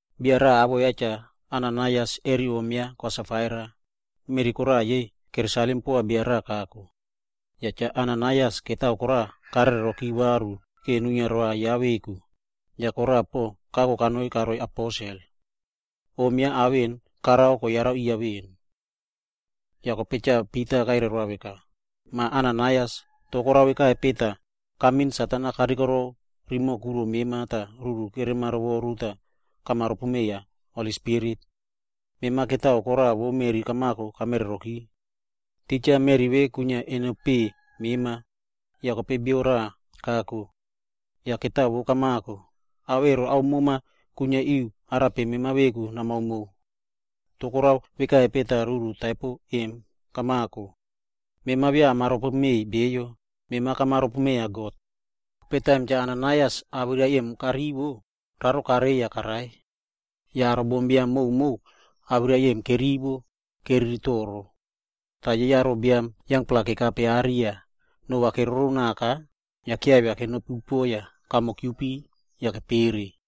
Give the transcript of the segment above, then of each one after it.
Bia raꞌa awoꞌo ya Cha Ananaias re om ya Kwa Safaira, meꞌri koraꞌa yei keresalim poa bio raꞌa kako. Yah Cha Ananaias mani koraꞌa karereroki varu vora nuinia roa ya veku, tah koraꞌa pon kako kanoi karoiy aposel. Om ya ao vemona karao vemo koyara riya veꞌen. Yah kope Cha Pita kairai roa veka, “Mah Ananaias, korao vekaro, tah mema kamin Satan-a kanoi romoꞌo kuro mema tah ruru mema karovoru yah kamaropome Holi Spirit? Mema mani koraꞌa vo meꞌri kamako emo, kamereroki.” Titja meꞌri vemona kwinia eno peꞌe mema, yah kope bio raꞌa kako. Yah mani vo kamako, ao ero ao mema yah kuiniari arape mema veku namao mow. Toh korao vekaro, tah ruru taipo vemo kamako? Mema beya kamaropomeiy bio vai, mema kamaropomeiya God. Kope taim Cha Ananaias awirai emo karivo, yah kararo karei yah karai. Yah kope aro bombiam koka awirai vemo kerivo, tah keriri toro. Yah aro biam yangpla kekape are yah aimino keroronaka, yah kiavia kenopi upuoꞌo yah mare kiupi yah kepere.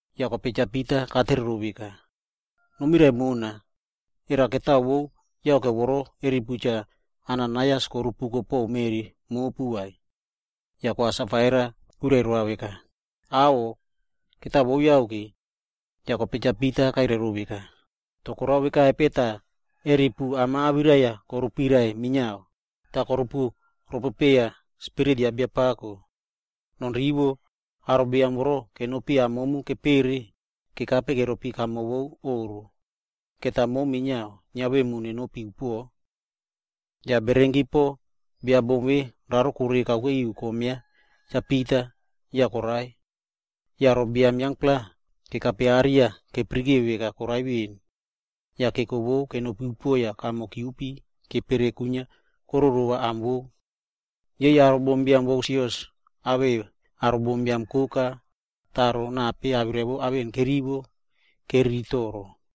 Yah kope Cha Pita katere rou veka, “Nomirai mona, era mani vo yake vemona repu Cha Ananaias korupuko po meꞌri mopu ve?” Yah Kwa Safaira kwirai roa veka, “Aꞌho, mani vo yake.” Yah kope Cha Pita kairai rou veka, “Korao veka rope tah momu repu am-a awirai-a korupirai minia, tah korupuropope Spirit ya Biapako? Nonrivo, aro biam vemona kenopi am momu kepere emo, kekape keropi veꞌen kamo vo oꞌro, yah momu minia va neko nenopi upuoꞌo.” Yah kope bererenki bia bom vemo koraro korei kakuke ri kom ya Cha Pita yah korai. Yah aro biam yangpla kekape are tah keyara veka yah korai veni. Yah keko vo kenopi tah mare kiupi yah kepere kwinia kororova am vou. Aro bombiam vo sios awei aro bombiam koka yah nape awirai vemona kerivo emo, keriri toro.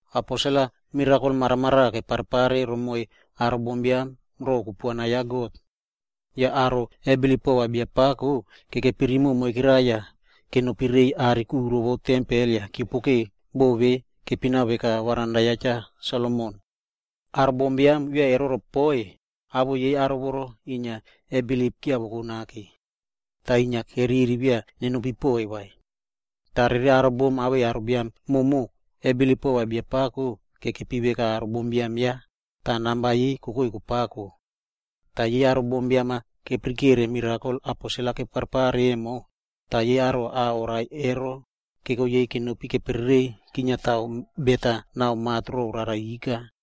Aposel-a mirakol maramaraꞌa keparepare romoiy aro bombiam ro kupuana ya God. Yah aro kebilip pova Biapako, romoꞌo ketiti moikera yah inia kenopi rei are vo tempel tah keopokeu minia boꞌo vemona kepina veka jamankoko ya Cha Solomon. Aro bombiam ovu beya keroropoiy vai, awoꞌo yei aro vemo kebilip inia kiavoko nake. Toh keriri beya inia kenopi poiy vai. Toh yei aro biam awere aro bom koka kebilip pova Biapako tah kekepi veka aro bombiam ya, namba yei kokoi kopako. Yah aro bombiam-a keyarare mirakol aposel-a keparepare emo, tah aro au-a korai emo kiavei kenopi keperereiy kiniata bet na mat rore rara ika.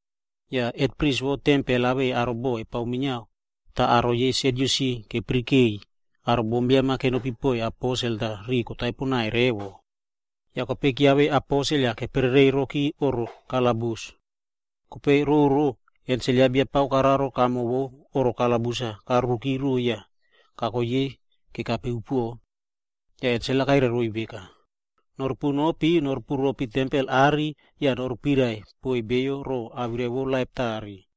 Yah hetpris vo tempel awei aro ya bova kepao minia, yei aro yei Sadyusi, kepirikeiy aro bombiam-a kenopi poiy aposel tah rimoꞌo yei kotaipo poaka. Yah kope kiavei aposel tah kepereirokipe oꞌro kalabus. Kope roro ensel ya Biapako koraro kamo oꞌro kalabus-a korurikire roiy yah koko yei kekape upuoꞌo. Yah ensel-a kwirai roiy veka, “Norupunopi tempel are yah nopuirai poiy beyo pore awirai vo laip tare.”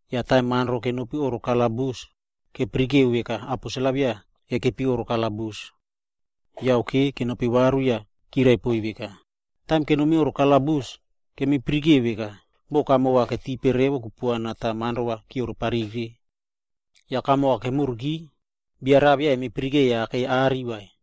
Toh kope taim polis-a kenopi oꞌro kalabus, keyara veka aposel-a beya kekepi oꞌro kalabus vai. Yake, kenopi varu yah chirai poiy veka, “Taim kenomi oꞌro kalabus, kemiyara veka kamo ketipe revo kokupuana yah polis-a keropi papire. Yah kope taim kamo kemuriki, beya bia raꞌa kemiyaraka kakei are vai.”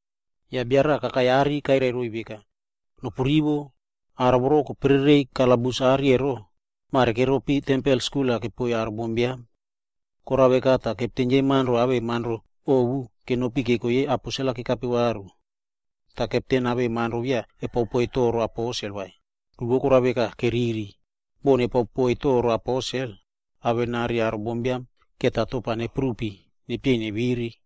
Yah bia raꞌa kakai are tah kairai roiy veka, “Nopurivo, aro voro kopereiroki kalabus ero, mare keropi tempel skul-a kepao poiy aro bombiam.” Yah kope kepten yei polis awei polis ovu kenopi keko yei aposel kekape varu. Yah kepten awei polis-a beya kepao poiy aposel-a toro vai, ku vo korao veka, keriri boh nepao poiy aposel-a toro, va aro bombiam-a akairi nepuna yah neteiy neviri.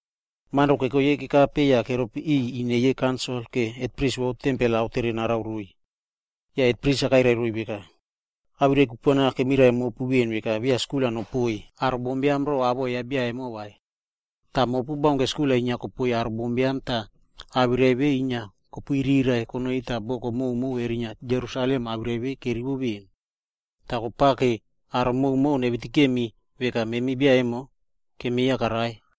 Polis-a keko yei kekape are yah keropi ine yei kaunsil vora hetpris vo tempel-a aotere narao roiy. Yah hetpris-a kairai roiy veka, “Memi awirai kupuana kemirai mopu veꞌen veka beya skul-a nopoiy aro bombiam ro awoꞌo ya bia vemonamo vai. Toh mopu baunke skul-a inia kopao poiy aro bombiam yah awirai vemona inia kopuiriraiꞌvo konoi tah boko prumo kerinia Jerusalem awirai vemo kerivo veꞌeni. Yah kopao vora aro koka va nevitikemi veka memi bia emo kemieya karai.”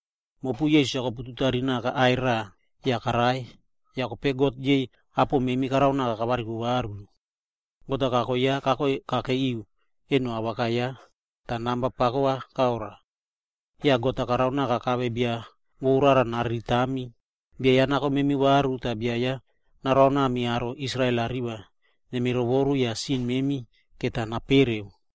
Mopu Jisas-a kopututari naka aꞌai raꞌab yah karai, kope God yei apo memi karao kavariko varu. God-a kaiviako kakei eno paraꞌa awaka ya,c tah namba pako karoa. Yah God-a karaonaka kave bia vo rara nariritami, bia vo nako memi varu, bia vo narao Israel-a romoꞌo nemirovoru yah sin memi napereuki.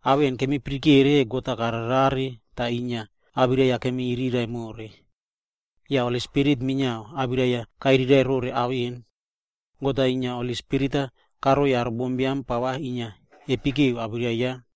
Memi kemipirikere ao vemona God-a kararerare tah awirai-a inia kemiriraiꞌvo more. Yah Holi Spirit minia awirai-a kwirai rore ao vemonamo. God-a Holi Spirit-a karoiy aro bombiam inia pava kepekeu awirai ya.”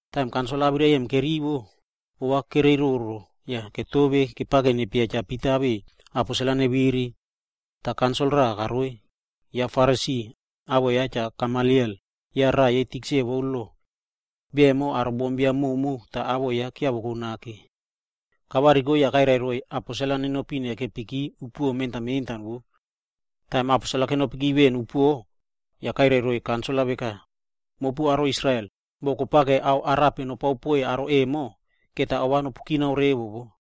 Taim kaunsil-a awirai vemona kerivo, ova kereiroro yah ketove tah kepao nepieya Cha Pita awei aposel neviri. Toh kope kaunsil raꞌa karoi, ya Farasi, awoꞌo ya Cha Gamaliel, ya raꞌa yei tikse vo lo. Bia emo, aro bombiam koka awoꞌo ya kiavoko nake. Kavariko yah kairai roiy va aposel-a nenopi nekepiki mentan mentanki upuoꞌo kamavi. Taim aposel-a kenopi veꞌen upuoꞌo, yah kope kairai roiy kaunsil veka, “Mopu aro Israel, boh kopao ao arape nopao poiy aro vemona, ova nopukinaki revo wo.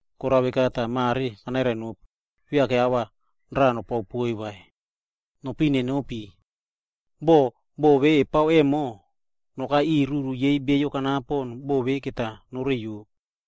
Korao veka tah mare kanairai nopu, beya ava raꞌa nopao poiy vai. Nopiꞌin nenopi. Boh boꞌo vemona kepao emo, nokai ruru ya bia kanapo, boꞌo vemo va noreiyo.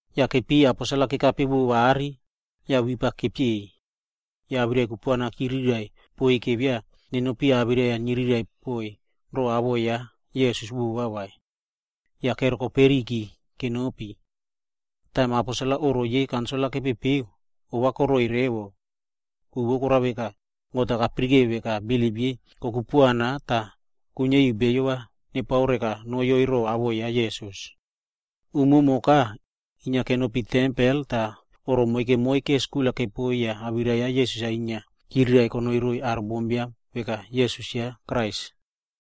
Yah kope keipiy aposel-a kekape varu are, yah wip-a kepieiy. Yah awirai kupuana chirai poiy beya awirai niyrai vova po awoꞌo ya Jisas vai. Yah kerokoperiyki kenopi. Yah taim aposel-a oꞌro kaunsil-a kepepeu, ovakoroiy poaka. Ku vo korao veka, God-a kayara veka bilip yei kokupuana yah kuiniari bio nepao rekanoyoi ro awoꞌo ya Jisas. Umumoka, inia kenopi tempel tah oꞌro moike moike yah awirai ya Jisas-a inia chiriraiꞌvo konoi roiy aro bombiam veka Jisas ya Krais.